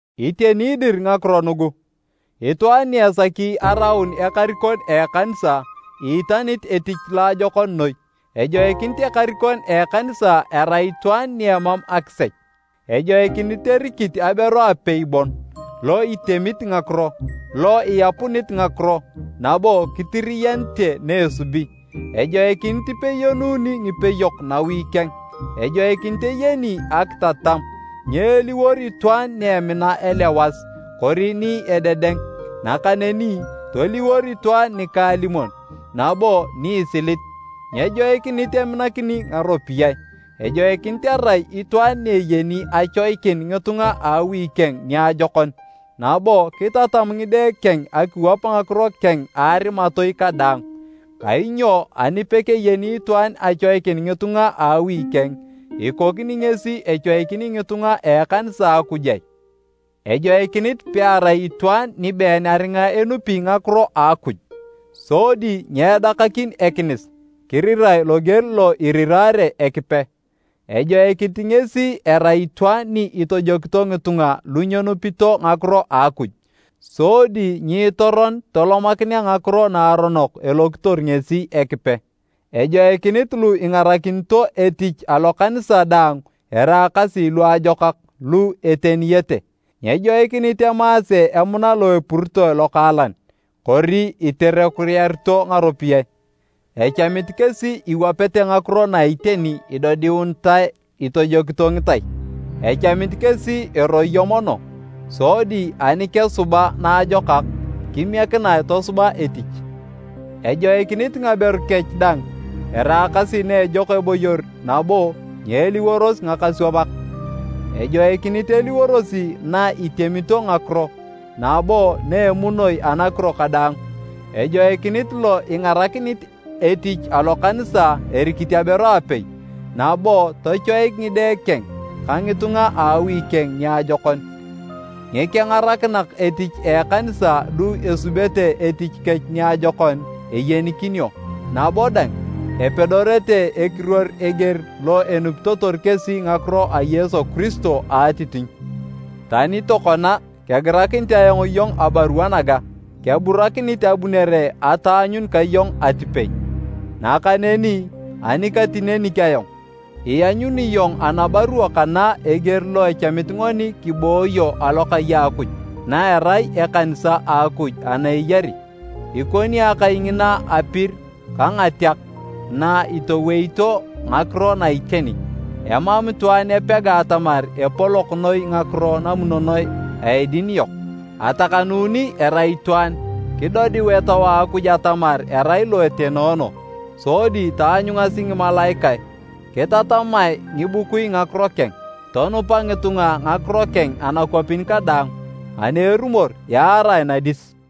Iteni dir ngakiro nugu. Itwaan ni esaki araun ekarikon a ekanisa, iitanit etich loajokon noi. Ejoikinit ekarikon a ekanisa erai itwaan ni emam akisech, ejoikinit erikit aberu apei bon, lo itemit ngakiro, lo iapunit ngakiro nabo kitiriyanite na esubi. Ejoikinit ipeyeununi ngipeyok nawi keng, ejoikinit eyeni akitatam, nyeeliwor itwaan ni emina elewas kori ni ededeng, nakaneni toliwor itwaan nikaalimon nabo ni isilit, nyejoikinit eminakini ngaropiyae. Ejoikinit erai itwaan ni eyeni achoikin ngitunga a awi keng niajokon nabo kitatam ngide keng akiwap ngakiro keng a arimatoi kadaang. Kainyo ani pekeyeni itwaan achoikin ngitunga a awi keng, ikokini ngesi echoikini ngitunga a ekanisa a Akuj ai? Ejoikinit pearai itwaan ni been aringa enupi ngakiro a Akuj, sodi nyedakakin ekinis kirirae loger lo erirare Ekipe. Ejoikinit ngesi erai itwaan ni itojokito ngitunga lu nyenupito ngakiro a Akuj, sodi nyiitoron tolomakinea ngakiro naaronok elokitor ngesi Ekipe. Ejoikinit lu ingarakinito etich alokanisa dang eraakasi luajokak lu eteniyete, nyejoikinit emaase emuna lo epuritoe lokaalan kori iterekuyarito ngaropiyae. Echamit kesi iwapete ngakiro na iteni idodiunitae itojokito ngitai. Echamit kesi eroyo mono, sodi ani kesuba naajokak, kimiekinae tosuba etich. Ejoikinit ngaberu kech dang eraakasi na ejok eboyor nabo nyeliworosi ngakaswamak, ejoikinit eliworosi na itemito ngakiro nabo na emunoi anakiro kadaang. Ejoikinit lo ingarakinit etich alokanisa erikit aberu apei, nabo tochoik ngide keng ka ngitunga a awi keng niajokon. Ngikengarakinak etich a ekanisa lu esubete etich kech niajokon, eyenikinio, nabo dang, epedorete ekiruor eger lo enupitotor kesi ngakiro a Yesu Kiristo a atitinyu. Tani tokona kegirakinit ayong iyong abarua naga, keburakinit abunere ataanyun ka iyong atipei. Nakaneni ani katinenik ayong, ianyuni iyong anabarua kana eger lo echamit ngoni kibooyo alokai a Akuj, na erai ekanisa a Akuj ana eyari. Ikoni akai ngina apir ka ngateak na itoweito ngakiro na iteni. Emam itwaan epega atamar epolok noi ngakiro namunonoe a edin yok. Atakanuni erai itwaan, kidodiu Etau a Akuj atamar erai lo etenoono, sodi taanyungasi ngimalaikae. Kitatamae ngibukui ngakiro keng, tonupa ngitunga ngakiro keng anakwapin kadaang, ani erumor yaarae nadis.